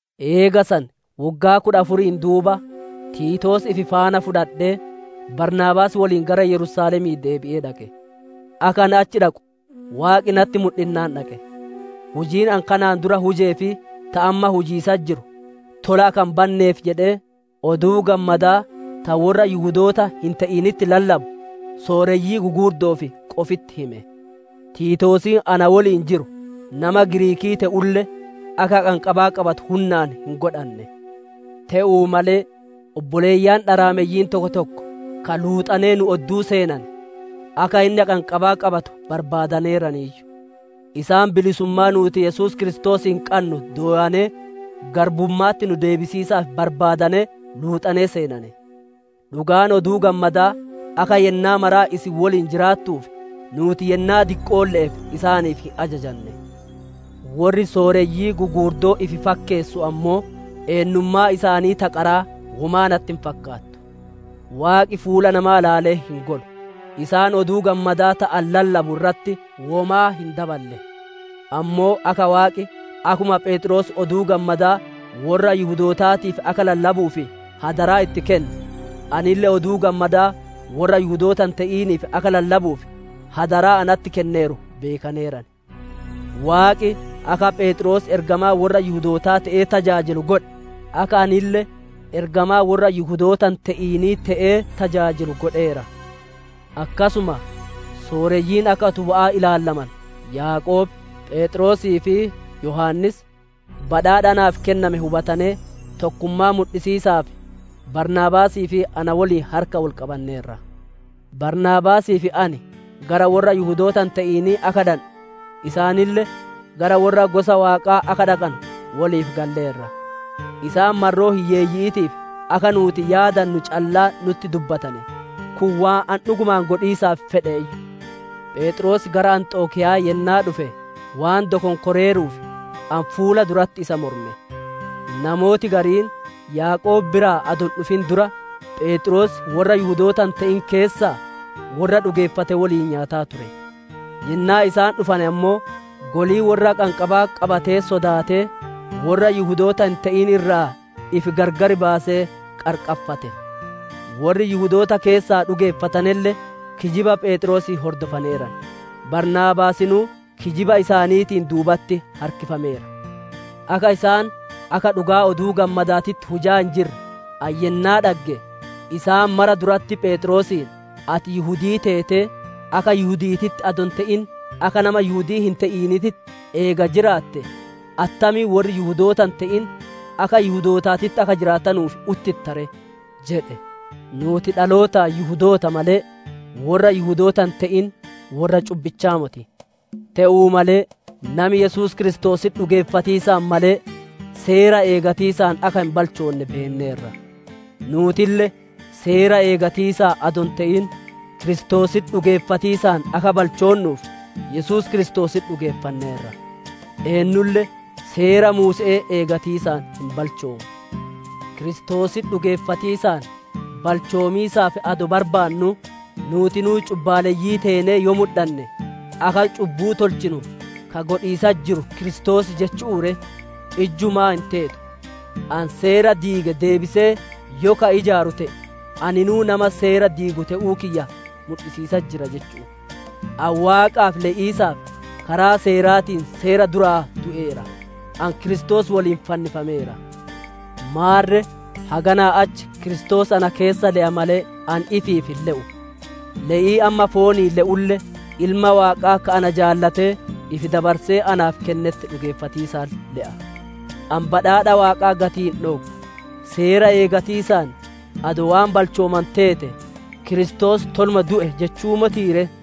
Eega san woggaa kudha afuriin duuba, Tiitoos ifi faana fudhadhee, Baarnaabaas woliin gara Yerusaalemii deebi'ee dhaqe. Akka ani achi dhaqu, Waaqi natti mudhinnaan dhaqe. Hujiin ani kanaan dura hujee fi ta amma hujiisatti jiru, tola akka hin banneef jedhee, Oduu Gammadaa ta worra Yihudoota hin te'initti lallabu, sooreyyii gugurdo'oof qofitti hime. Tiitoosiin na woliin jiru, nama Giriikii te'ulle, akka haqanqabaa qabatu hunnaan hin godhanne. Te'uu malee obboleeyyan dharaameyyiin tokko tokko, ka luuxanee nu odduu seenane, akka inni haqanqabaa qabatu barbaadaneeraniiyyu. Isaan bilisummaa nuuti Yesuus Kiristoosiin qannu dooyanee, garbumma'atti nu deebisiisaaf barbaadanee, luuxanee seenane. Dhugaan Oduu Gammadaa, akka yennaa mara isin woliin jiraattuuf, nuuti yennaa diqqolle'eef isaaniif hin ajajane. Worri sooreyyii gugurdoo ifi fakkeessuu ammoo, eennummaan isaanii ta qaraa womaa natti hin fakkaatu; Waaqi fuula namaa ilaalee hin golu; isaan Oduu Gammadaa ta ani lallabu irratti womaa hin daballe. Ammoo akka Waaqi, akkuma Pheexroos Oduu Gammadaa worra Yihudootaatiif akka lallabuuf adaraa itti kenne, anille Oduu Gammadaa worra Yihudoota hin te'iniif, akka lallabuuf adaraa natti kenneeru beekaneeran. Waaqi akka Pheexroos ergamaa worra Yihudootaa te'ee tajaajilu godhe, akka anille ergamaa worra Yihudoota hin te'inii te'ee tajaajilu godheera. Akkasuma sooreyyiin akka utuba'aa ilaalamanu Yaaqoob, Pheexroosii fi Yohaannis, badhaadha naaf kenname hubatanee, tokkummaa mudhisiisaaf Baarnaabaasii fi na woliin harka wol qabanneerra; Baarnaabaasii fi ani gara worra Yihudoota hin te'inii akka dhandhu, isaaniille gara worra gosa Waaqaa akka dhaqanu woliif galleerra. Isaan marroo hiyyeeyyi'iitiif akka nuuti yaadannu callaa nutti dubbatane, kun waan ani dhugumaan godhiisaaf fedhuuyyu. Pheexroos gara Anxokiya'aa yennaa dhufe waan dokonkoreeruuf, ani fuula duratti isa morme. Namooti gariin Yaaqoob biraa adoo hin dhufin dura, Pheexroos worra Yihudoota hin te'in keessaa worra dhugeeffate woliin nyaataa ture; yennaa isaan dhufane ammoo, golii worra haqanqabaa qabatee sodaatee, worra Yihudoota hin te'in irraa ifi gargar baasee qarqarfate; Worri Yihudoota keessaa dhugeeffatanelle, kijiba Pheexroosii hordofaneeran; Baarnaabaasinuu kijiba isaaniitiin duubatti harkifameera. Akka isaan akka dhugaa Oduu Gammadaatitti hujaa hin jirre, ani yennaa dhagge, isaan mara duratti Pheexroosiin, «Ati Yihudii teetee, akka Yihudi'iititti adoo hin te'in, akka nama Yihudii hin te'iniititti eega jiraatte, attamiin worri Yihudoota hin te'in, akka Yihudootaatitti akka jiraatuuf uttitta ree?» jedhe. Nuuti dhalootaan Yihudoota malee, worra Yihudoota hin te'in worra cubbichaa moti. Te'uu malee nami Yesuus Kiristoositti dhugeeffatiisaan malee, Seera eeggatiisaan akka hin balchoonne beenneerra. Nuutille Seera eeggatiisaan adoo hin te'in, Kiristoositti dhugeeffatiisaan akka balchoonnuuf Yesuus Kiristoositti dhugeeffanneerra. Eennulle Seera Muuse'ee eeggatiisaan hin balchoomu. Kiristoositti dhugeeffatiisaan balchoomiisaaf adoo barbaannuu, nuutinuu cubbaalleyyii teenee yoo mudhanne, akka cubbuu tolchinu ka godhiisatti jiru Kiristoos jechu'u ree? Ijjumaa, hin teetu! Ani Seera diige deebisee yoo ka ijaaru te'e, aninuu nama Seera diigu te'uu kiyya mudhisiisatti jira jechu'u. Ani Waaqaaf le'iisaaf, karaa Seeraatiin Seera duraa du'eera; ani Kiristoos woliin fannifameera. Maarre haganaa achi Kiristoos ana keessa le'a malee, ani ifiif hin le'u. Le'ii amma fooniin le'ulle, Ilma Waaqaa ka ana jaalatee, ifi dabarsee naaf kennetti dhugeeffatiisaan le'a. Ani badhaadha Waaqaa gatii hin dhooggu; Seera eeggatiisaan adoo waan balchoomanu teete, Kiristoos toluma du'e jechu'uu motii ree!